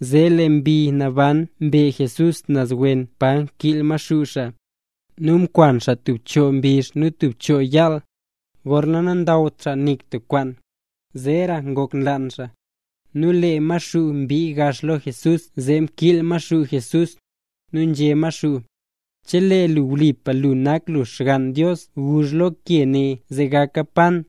Zee lee Mbi Naban mbe Jesús naz wen pa kiil Maxuu xaa. Nu mkwan xaa tub choo mbizh nu tub choo yaal, gorna nandawt xaa nik tik kwaan, zeera ngok nlaan xaa. Nu lee Maxuu mbii gax lo Jesús zee kiil Maxuu Jesús, nu nzhé Maxuu: —Chelee lu wlipa lu nak lu Xgann Dios guzh lu lo re ke ne zee gaka pan.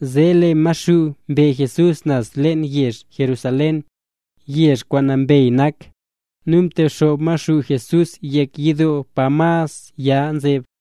Zee lee Maxuu mbe Jesús naz leen yezh Jerusalén, yezh kwaan nambey nak, nu mtexoob Maxuu Jesús yek yidoo pa mas ya nzeb,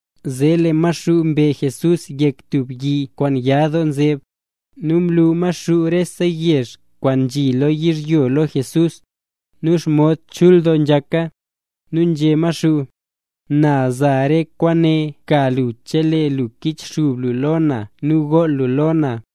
Zee lee Maxuu mbe Jesús yek tub yi kwaan ya doo nzeb, nu mlu Maxuu rese yezh kwaan nzhi lo yizhyo lo Jesús, nu xomod chul doo nzhaka. Nu nzhé Maxuu: —Na za rese kwaane ka lu chelee lu kichxub lu lo na nu gool lu lo na.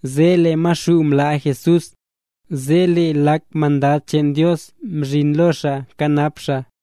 Zee lee Maxuu mlaa Jesús, zee lee lak mandad cheen Dios mzhin lo xaa kanap xaa.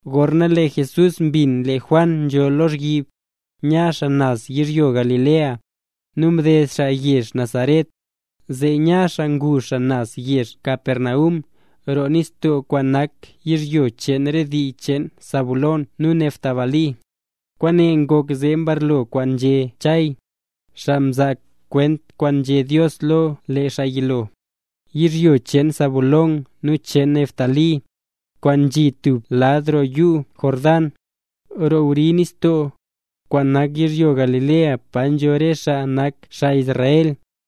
Gorna lee Jesús mbin lee Juan nzho lozhyib, nya xaa naz yizhyo Galilea. Nu mded xaa yezh Nazaret, zee nya xaa ngu xaa naz yezh Capernaum, roo nistoo kwaan nak yizhyo cheen re dii cheen Zabulón nu Neftalí. Kwaane ngok zee mbarlo kwaan nzhé Chay, xaa mzaa kwent kwaan nzhé Dios lo lee xaa yilo: Yizhyo cheen Zabulón nu cheen Neftalí, kwaan nzhi stub lad roo yuu Jordán, roo wri nistoo, kwaan nak yizhyo Galilea pa nzho re xaa nanakt xaa Israel,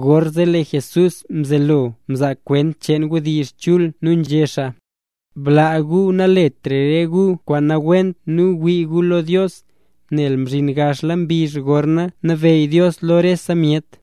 Gorzee lee Jesús mzelo mzaa kwent cheen wdizh chul nu nzhé xaa: —Blaa gu naletra gu re kwaan nawent nu wii gu lo Dios, nel mzhin gaxla mbizh gorna nabeyy Dios lo rese myet.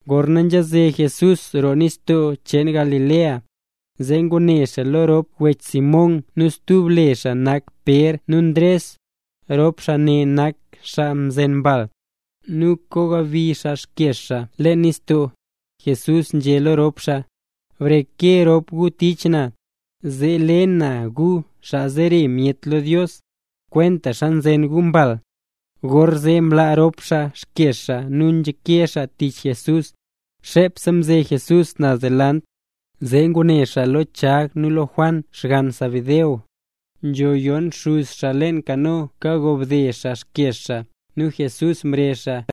Gorna nzhaze Jesús roo nistoo cheen Galilea, zee ngune xaa lo rop wech Simón (nu stub le xaa nak Pér) nu Ndres. Rop xaa ne nak xaa nzen mbal, nu kagobi xaa xkyeez xaa leen nis. Jesús nzhé lo rop xaa: —Breke rop gu tich na, zee le na gu xaa zere myet lo Dios, kwentaxa nzen gu mbal. Gorzee mlaa rop xaa xkyeez xaa nu nzhake xaa tich Jesús. Xepse mze Jesús naz delant, zee ngune xaa lo Chag nu Juan xgann Zebedeo, nzho yon xuz xaa leen kano kagobde xaa xkyeez xaa. Nu Jesús mrezh xaa.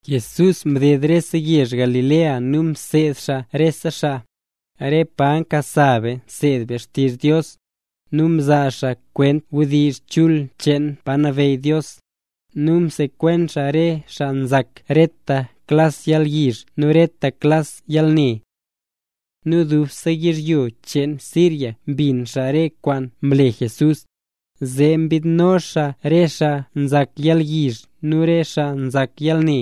Jesús mded rese yezh Galilea nu mseed xaa rese xaa, re pa nkasa be nseed be xtizh Dios, nu mzaa xaa kwent wdizh chul cheen pa nabeyy Dios, nu msekwen xaa re xaa nzak reta klas yalyizh nu reta klas yalne. Nu dubse yizhyo cheen Siria mbin xaa re kwaan mle Jesús, zee nyiidno xaa re xaa nzak yalyizh nu re xaa nzak yalne,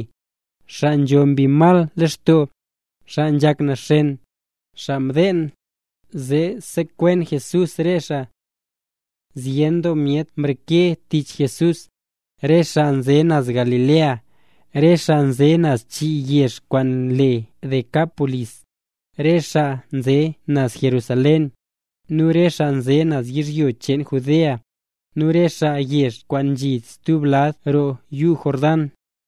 xaa nzho mbi mal lextoo, xaa nzhak naxen, xaa mdeen, zee sekwen Jesús re xaa. Zyen doo myet mreke tich Jesús, re xaa nze naz Galilea, re xaa nze naz chii yezh kwaan le Decápolis, re xaa nze naz Jerusalén, nu re xaa nze naz yizhyo cheen Judea, nu re xaa yezh kwaan nzhi stub lad roo yuu Jordán.